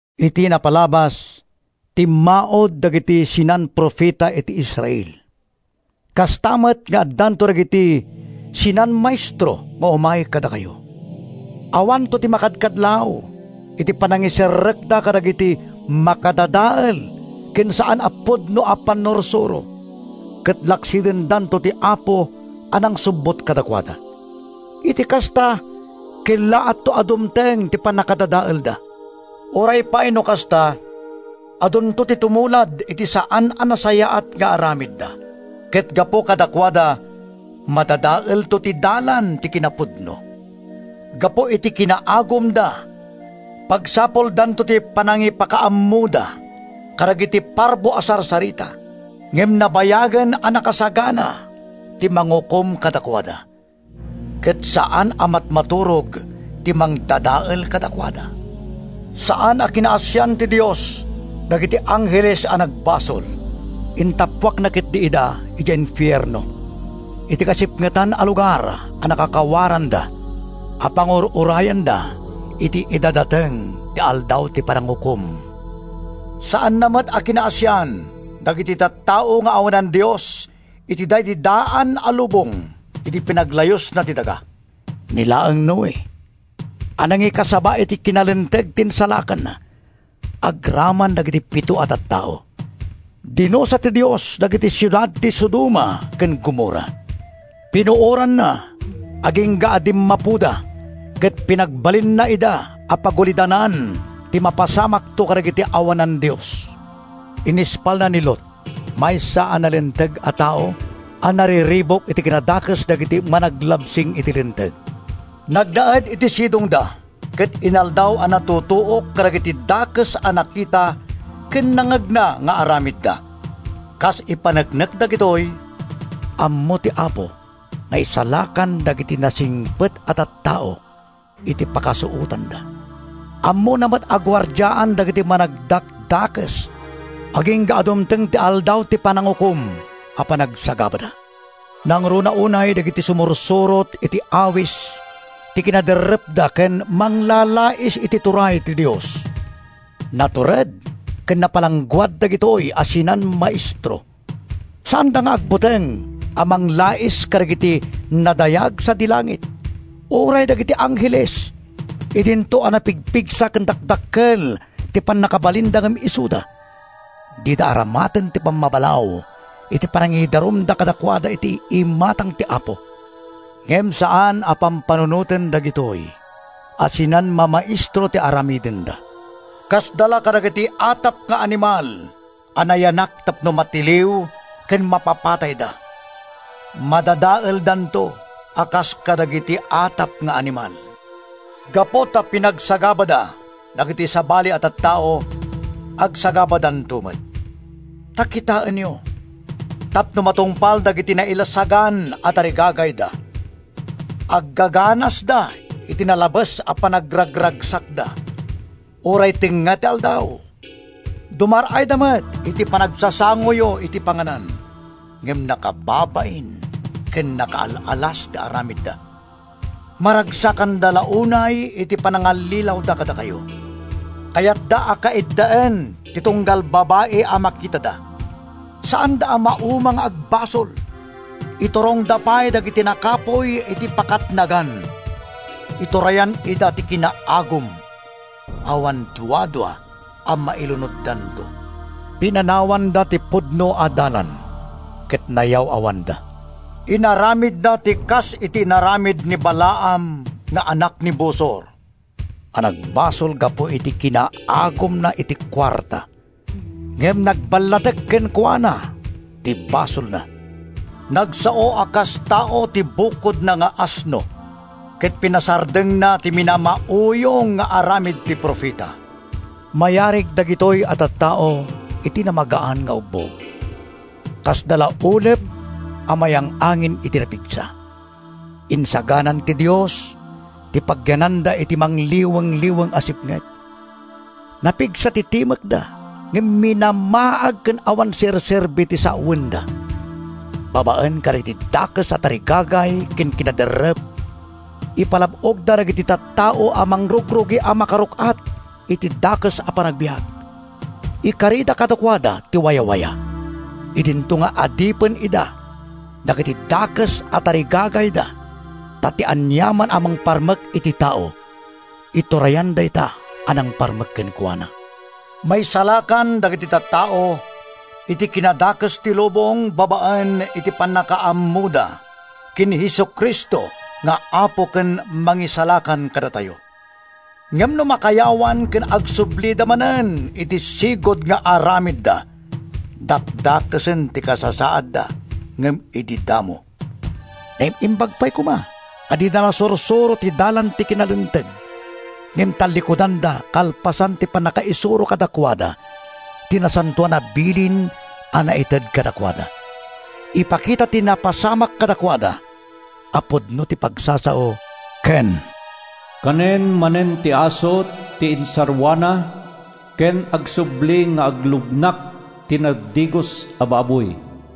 Iti napalabas, timmaud dagiti sinan-profeta iti Israel. Kasta met nga addanto dagiti sinan-maestro nga umay kadakayo. Awanto ti makadkadlaw iti panangiserrekda kadagiti makadadael ken saan a pudno a pannursuro ket laksidendanto ti Apo a nangsubbot kadakuada. Iti kasta, kellaatto a dumteng ti pannakadadaelda. Uray pay no kasta, adunto ti tumulad iti saan a nasayaat nga aramidda, ket gapu kadakuada, madadaelto ti Dalan ti kinapudno. Gapu iti kinaagumda, pagsapuldanto ti panangipakaammoda kadagiti parbo a sarsarita. Ngem nabayagen a nakasagana ti Mangukom kadakuada, ket saan a matmaturog ti Mangdadael kadakuada. Saan a kinaasian ti Dios dagiti angheles a nagbasol. Intappuakna ketdi ida idiay infierno, iti kasipngetan a lugar a nakakawaranda, a pangur-urayanda iti idadateng ti Aldaw ti Panangukom. Saanna met a kinaasian dagiti tattao nga awanan-dios iti daydi daan a lubong idi pinaglayusna ti daga. Ni laeng Noe a nangikasaba iti kinalinteg ti insalakanna agraman dagiti pito a tattao. Dinusa ti Dios dagiti siudad ti Sodoma ken Gomorra. Pinuoranna agingga a dimmapoda ket pinagbalinna ida a pagulidanan ti mapasamakto kadagiti awanan-dios. Inispalna ni Lot, maysa a nalinteg a tao a nariribuk iti kinadakes dagiti managlabsing iti linteg. Nagnaed iti sidongda ket inaldaw a natutuok kadagiti dakes a nakita ken nangngegna nga aramidda. Kas ipaneknek dagitoy, ammo ti Apo nga isalakan dagiti nasingpet a tattao iti pakasuotanda. Ammona met a guardiaan dagiti managdakdakes agingga a dumteng ti Aldaw ti Panangukom a panagsagabada, nangruna unay dagiti sumursurot iti awis ti kinaderrepda ken manglalais iti turay ti Dios. Natured ken napalangguad dagitoy a sinan-maestro. Saanda nga agbuteng a manglais kadagiti nadayag sadi langit. Uray dagiti angheles, idinto a napigpigsa ken dakdakkel ti pannakabalinda ngem isuda, dida aramaten ti pammabalaw iti panangidarumda kadakuada iti imatang ti Apo. Ngem saan a pampanunoten dagitoy a sinan-mamaestro ti aramidenda—kasdala kadagiti atap nga animal a nayanak tapno matiliw ken mapapatayda. Madadaeldanto a kas kadagiti atap nga animal. Gapu ta pinagsagabada dagiti sabali a tattao, agsagabadanto met. Ta kitaenyo, tapno matungpal dagiti nailasagan a tarigagayda, aggangganasda iti nalabes a panagraragsakda uray tengnga ti aldaw! Dumar-ayda met iti panagsasangoyo iti panganan, ngem nakababain ken nakaal-alas ti aramidda. Maragsakanda la unay iti panangallilawda kadakayo. Kayatda a kaiddaen ti tunggal babai a makitada; saanda a mauma nga agbasol. Iturongda pay dagiti nakapuy iti pakatnagan. Iturayan ida ti kinaagum. Awan duadua a mailunoddanto! Pinanawanda ti pudno a dalan ket nayaw-awanda. Inaramidda ti kas iti inaramid ni Balaam nga anak ni Bosor, a nagbasol gapu iti kinaagumna iti kuarta. Ngem nagballatek kenkuana ti basolna; nagsao a kas tao ti bakodna nga asno ket pinasardengna ti minamauyong nga aramid ti profeta. Mayarig dagitoy a tattao iti namagaan nga ubbog. Kasda la ulep a mayang-angin iti napigsa. Insaganan ti Dios ti pagyananda iti mangliwengliweng a sipnget. Napigsa ti timekda ngem minamaag ken awan serserbi ti sawenda. Babaen kadagiti dakes a tarigagay ken kinaderrep, ipalab-ogda dagiti tattao a mangrugrugi a makaruk-at iti dakes a panagbiag. Ikarida kadakuada ti wayawaya, idinto nga adipen ida dagiti dakes a tarigagayda ta ti aniaman a mangparmek iti tao, iturayan dayta a nangparmek kenkuana. Maisalakan dagiti tattao iti kinadakes ti lubong babaen iti pannakaammoda ken ni Jesu-Cristo nga Apo ken Mangisalakan kadatayo. Ngem no makayawan ken agsublida manen iti sigud nga aramidda, dakdakesen ti kasasaadda ngem idi damo. Naim-imbag pay koma a dida nasursuro ti dalan ti kinalinteg, ngem tallikudanda kalpasan ti pannakaisuro kadakuada ti nasantoan a bilin a naited kadakuada. Ipakita ti napasamak kadakuada a pudno ti pagsasao: “Kanen manen ti aso ti insarruana” ken “Agsubli nga aglugnak ti nadigos a baboy.”